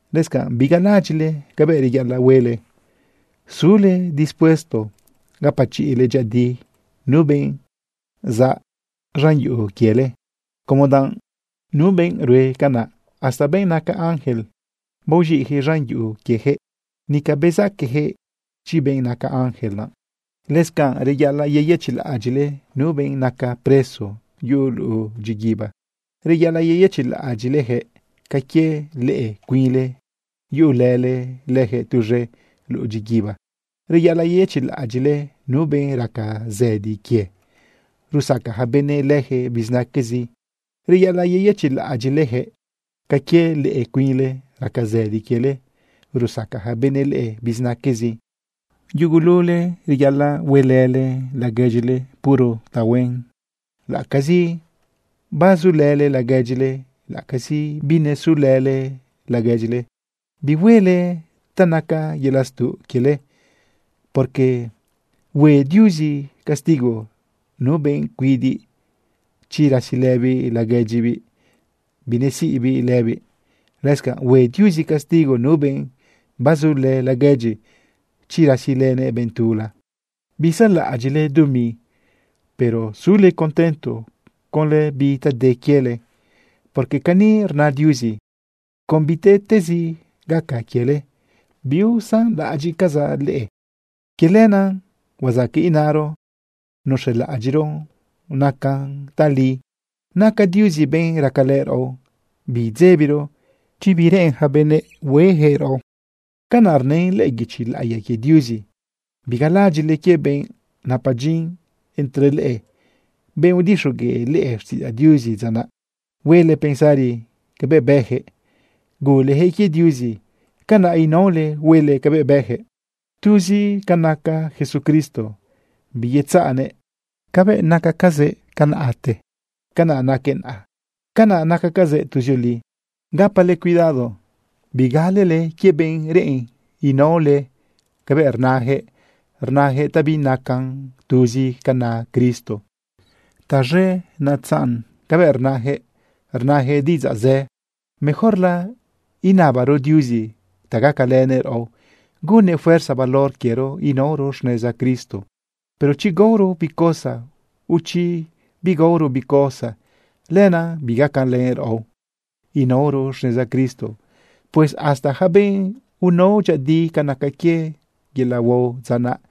Lëscanꞌ bigalaꞌadyiꞌle cabëꞌ reyaꞌalaꞌ huele sule dispuesto gapachiꞌle dyëꞌëdi nu benꞌ zaꞌ z̃an yuꞌu quiele, como danꞌ nu benꞌ rue canaꞌ, hasta benꞌ naca ángel baoz̃iꞌjëꞌ z̃an yuꞌu quiejëꞌ, nica bezaquejëꞌ chi benꞌ naca ángel naꞌ. Lëscanꞌ reyaꞌalaꞌ yeyëchiꞌlaꞌadyiꞌle nu benꞌ naca preso yuꞌu luꞌu dyiguiba. Reyaꞌalaꞌ yeyëchiꞌlaꞌadyiꞌlejëꞌ ca quie leꞌe cuinle yuꞌulële lëjëꞌ tuz̃e luꞌu dyiguiba. Reyaꞌalaꞌ yeyëchiꞌlaꞌadyiꞌle nu benꞌ raca zëdi quie, rusaca ja benëꞌ lëjëꞌ bizinaquezi. Reyaꞌalaꞌ yeyëchiꞌlaꞌadyiꞌlejëꞌ ca quie leꞌe cuinle raca zëdi quiele, rusaca ja benëꞌ leꞌe bizinaquezi. Yugulule reyaꞌalaꞌ huelële laguedyile puro tahuen. Laꞌacazi bazulële laguedyile, laꞌacazi binesulële laguedyile, bihuele ta naca yelaꞌ stuꞌ quiele, porque hue Diuzi castigo nu benꞌ cuidiꞌ, chi rasilëbiꞌ laguedyibiꞌ binesiꞌbiꞌ lëbiꞌ. Lëscanꞌ hue Diuzi castigo nu benꞌ bazulë laguedyi, chi rasilënëꞌ benꞌ tula. Bisaꞌlaꞌadyiꞌle dumi, pero sule contento conlë bi ta de quiele, porque cani rna Diuzi: “Con bitezi gaca quiele, biusanlaꞌadyiꞌcazaꞌ leꞌe.” Quie lenaꞌ huazaqueꞌ inaro nuz̃elaꞌadyiꞌro nacan tali: Naca Diuzi benꞌ racalë raꞌo, biidzebiro chi bi reꞌen ja benëꞌ huejëꞌraꞌo. Canaꞌ rnën lëꞌë guichi laꞌiya quie Diuzi. Bigalaꞌadyiꞌle quie benꞌ napa dyin entre leꞌe, benꞌ udixogueꞌ leꞌe xtiꞌidzaꞌ Diuzi dza naꞌ. Huele pensari cabëꞌ bëjëꞌ gulejëꞌ quie Diuzi, canaꞌ inaole huele cabëꞌ bëjëꞌ. Tuzi ca naca Jesucristo, biyetzaꞌnëꞌ. Cabëꞌ nacacazëꞌ tiempote, canaꞌ naquëꞌ naꞌa, canaꞌ nacacazëꞌ tuzioli. Gapale cuidado bigalele quie benꞌ reꞌen inaole cabëꞌ rnajëꞌ, rnajëꞌ ta binacan tuzi ca na Cristo. Taz̃e netzaꞌn cabëꞌ rnajëꞌ, rnajëꞌ diꞌidzaꞌ zë. Mejorla inabaro Diuzi ta gacalënëꞌ raꞌo gunnëꞌ fuerza valor quiero inaoro xneza Cristo. Pero chi gaoro bi cosa, o chi bigaoro bi cosa, lenaꞌ bigacalën raꞌo inaoro xneza Cristo. Pues hasta yaca benꞌ unao dyëꞌëdi ca naca quie yelaꞌ huao dza naꞌ,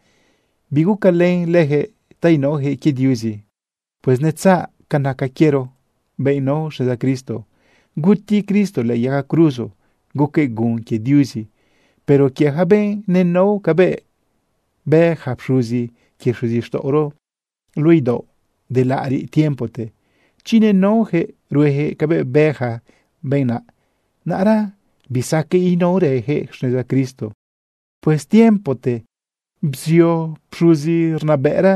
bigucalën lëjëꞌ ta inaojëꞌ quie Diuzi. Pues netzaꞌ ca naca quiero benꞌ nao xneza Cristo. Guti Cristo lëꞌë yaga cruzo guquëꞌ gun quie Diuzi. Pero quie yaca benꞌ nenao cabëꞌ bë yaca pxuzi quie xuzixtaꞌoro luꞌu idaoꞌ de laꞌariꞌ tiempote, chi nenaojëꞌ ruejëꞌ cabëꞌ bë ja benꞌ naꞌ, naꞌra bisaqueꞌ inaorëjëꞌ xneza Cristo. Pues tiempote bzio pxuzi rnabëꞌra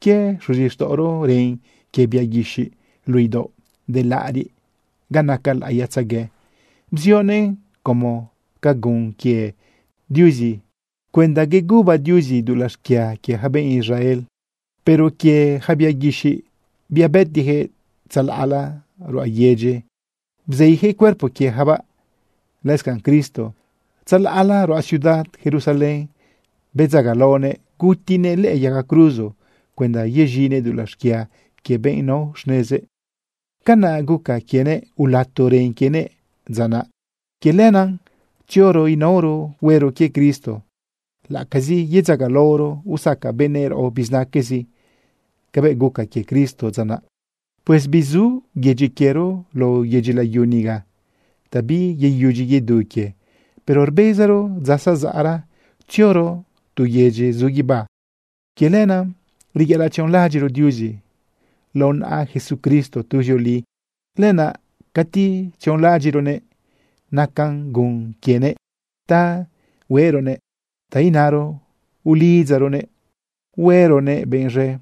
quie xuzixtaꞌoro ren quie bia guixiꞌ luꞌu idaoꞌ de laꞌariꞌ ga naca laꞌiyatzegue. Bzionëꞌn como ca gun quie Diuzi cuenda yeduba Diuzi dulaꞌ xquia quie ja benꞌ Israel. Pero quie yaca bia guixiꞌ, bia bëtijëꞌ, tzalaꞌla ruꞌa yedyi bzeijëꞌ cuerpo quieyacabaꞌ. Lëscanꞌ, Cristo, tzalaꞌla ruꞌa ciudad Jerusalén bedzagalaonëꞌ gutinëꞌ lëꞌë yaga cruzo cuenda yez̃inëꞌ dulaꞌ xquia quie benꞌ nao xnezëꞌ. Canaꞌ guca quienëꞌ ulato ren quienëꞌ dza naꞌ. Quie lenaꞌ tzioro inaoro huero quie Cristo, laꞌacazi yedzagalaoro usaca benëꞌ raꞌo bizinaquezi cabëꞌ guca quie Cristo dza naꞌ. Pues bizu yedyi quiero lao yedyi layu niga ta biyeyudyi yedu quie. Pero rbezaro dza zazaꞌra tzioro tu yedyi zu guibá. Quie lenaꞌ reyaꞌalaꞌ tzionlaꞌadyiꞌro Diuzi lao naꞌa Jesucristo tuzioli. Lenaꞌ cati tzionlaꞌadyiꞌronëꞌ nacan gun quienëꞌ ta hueꞌronëꞌ, ta inaro, ulidzaronëꞌ hueronëꞌ benꞌ z̃e.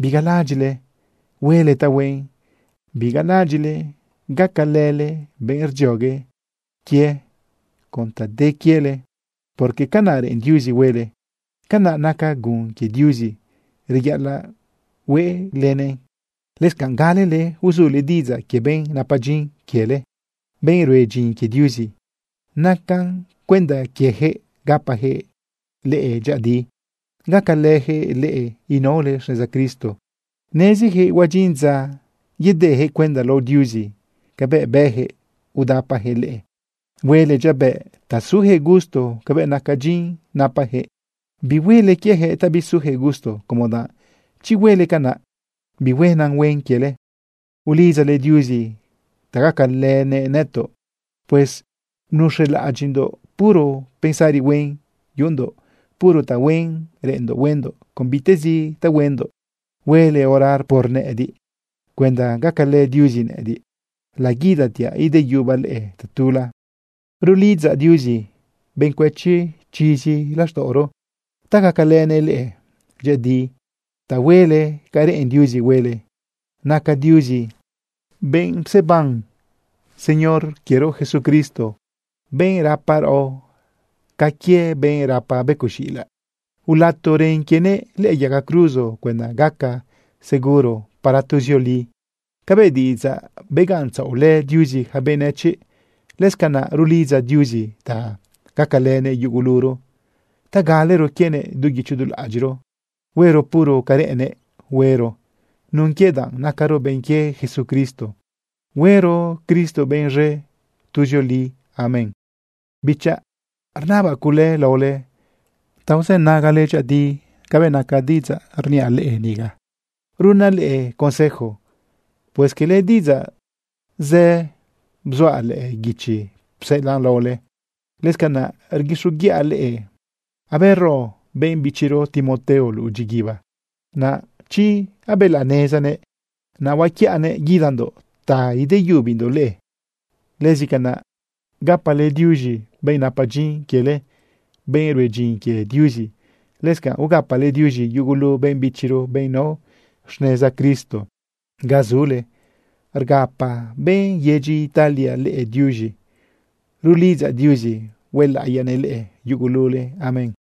Bigalaꞌadyiꞌle huele tahuen. Bigalaꞌadyiꞌle gacalële benꞌ rdziogue quie con ta de quiele, porque canaꞌ reꞌen Diuzi huele, canaꞌ naca gun quie Diuzi reyaꞌalaꞌ hueꞌlenëꞌ. Lëscanꞌ galele uzule diꞌidzaꞌ quie benꞌ napa dyin quiele, benꞌ rue dyin quie Diuzi. Naca cuenda quiejëꞌ gapajëꞌ leꞌe dyëꞌëdi, gacalëjëꞌ leꞌe inaole xneza Cristo. Nezijëꞌ huadyin dza yedejëꞌ cuenda lao Diuzi cabëꞌ bëjëꞌ udapajëꞌ leꞌe. Huele dyabëꞌ ta sujëꞌ gusto cabëꞌ naca dyin napajëꞌ. Bihuele quiejëꞌ ta bisujëꞌ gusto, como danꞌ chi huele canaꞌ, bihuena huen quiele. Ulidzale Diuzi ta gacalënëꞌ nëtoꞌ. Pues nuz̃elaꞌadyiꞌndoꞌ puro pensari huen yuꞌundoꞌ, puro tahuen reꞌenndoꞌ huendoꞌ con bitezi ta huendoꞌ. Huele orar por nëꞌëdiꞌ cuenda gacalë Diuzi nëꞌëdiꞌ laguidatiaꞌ ideyubaꞌ leꞌe tatula. Rulidzaꞌ Diuzi, benꞌ cuëchi chizi laxtaꞌoro, ta gacalënëꞌ leꞌe dyëꞌëdi ta huele ca reꞌen Diuzi huele. Naca Diuzi benꞌ pseban Señor quiero Jesucristo, benꞌ rapa raꞌo ca quie benꞌ rapa becoꞌ z̃iꞌilaꞌ, ulato ren quienëꞌ lëꞌë yaga cruzo cuenda gaca seguro para tuzioli cabëꞌ diꞌidzaꞌ begaꞌntzaꞌolë Diuzi yaca benëchiꞌ. Lëscanaꞌ rulidzaꞌ Diuzi ta gacalënëꞌ yuguluro ta galero quienëꞌ du guicho du laꞌadyiꞌro, huero puro ca reꞌennëꞌ huero nun quie danꞌ nacaro benꞌ quie Jesucristo. ¡Huero Cristo benꞌ z̃e tuzioli! Amén. Bichaꞌ, rnabaꞌ cule laole ta uzënagale dyëꞌëdi cabëꞌ naca diꞌidzaꞌ uniaꞌ leꞌe niga runaꞌ leꞌe consejo. Pues quele diꞌidzaꞌ zë bzuaꞌ lëꞌë guichi pseꞌelaꞌn laole. Lëscanaꞌ rguixoguiꞌa leꞌe abero benꞌ bichiro Timoteo luꞌu dyiguiba. Naꞌra chi abelaꞌnezanëꞌ, naꞌ huaquiꞌanëꞌ guidandoꞌ ta ideyubindoꞌ leꞌe. Lëscanaꞌ gapale diuz̃i benꞌ napa dyin quiele, benꞌ rue dyin quie Diuzi. Lëscanꞌ gapale diuz̃i yugulu benꞌ bichiro, benꞌ nao xneza Cristo ga zule. Rgapa benꞌ yedyi Italia leꞌe diuz̃i. Rulidzaꞌ Diuzi huelaꞌiyanëꞌ leꞌe yugulule. Amén.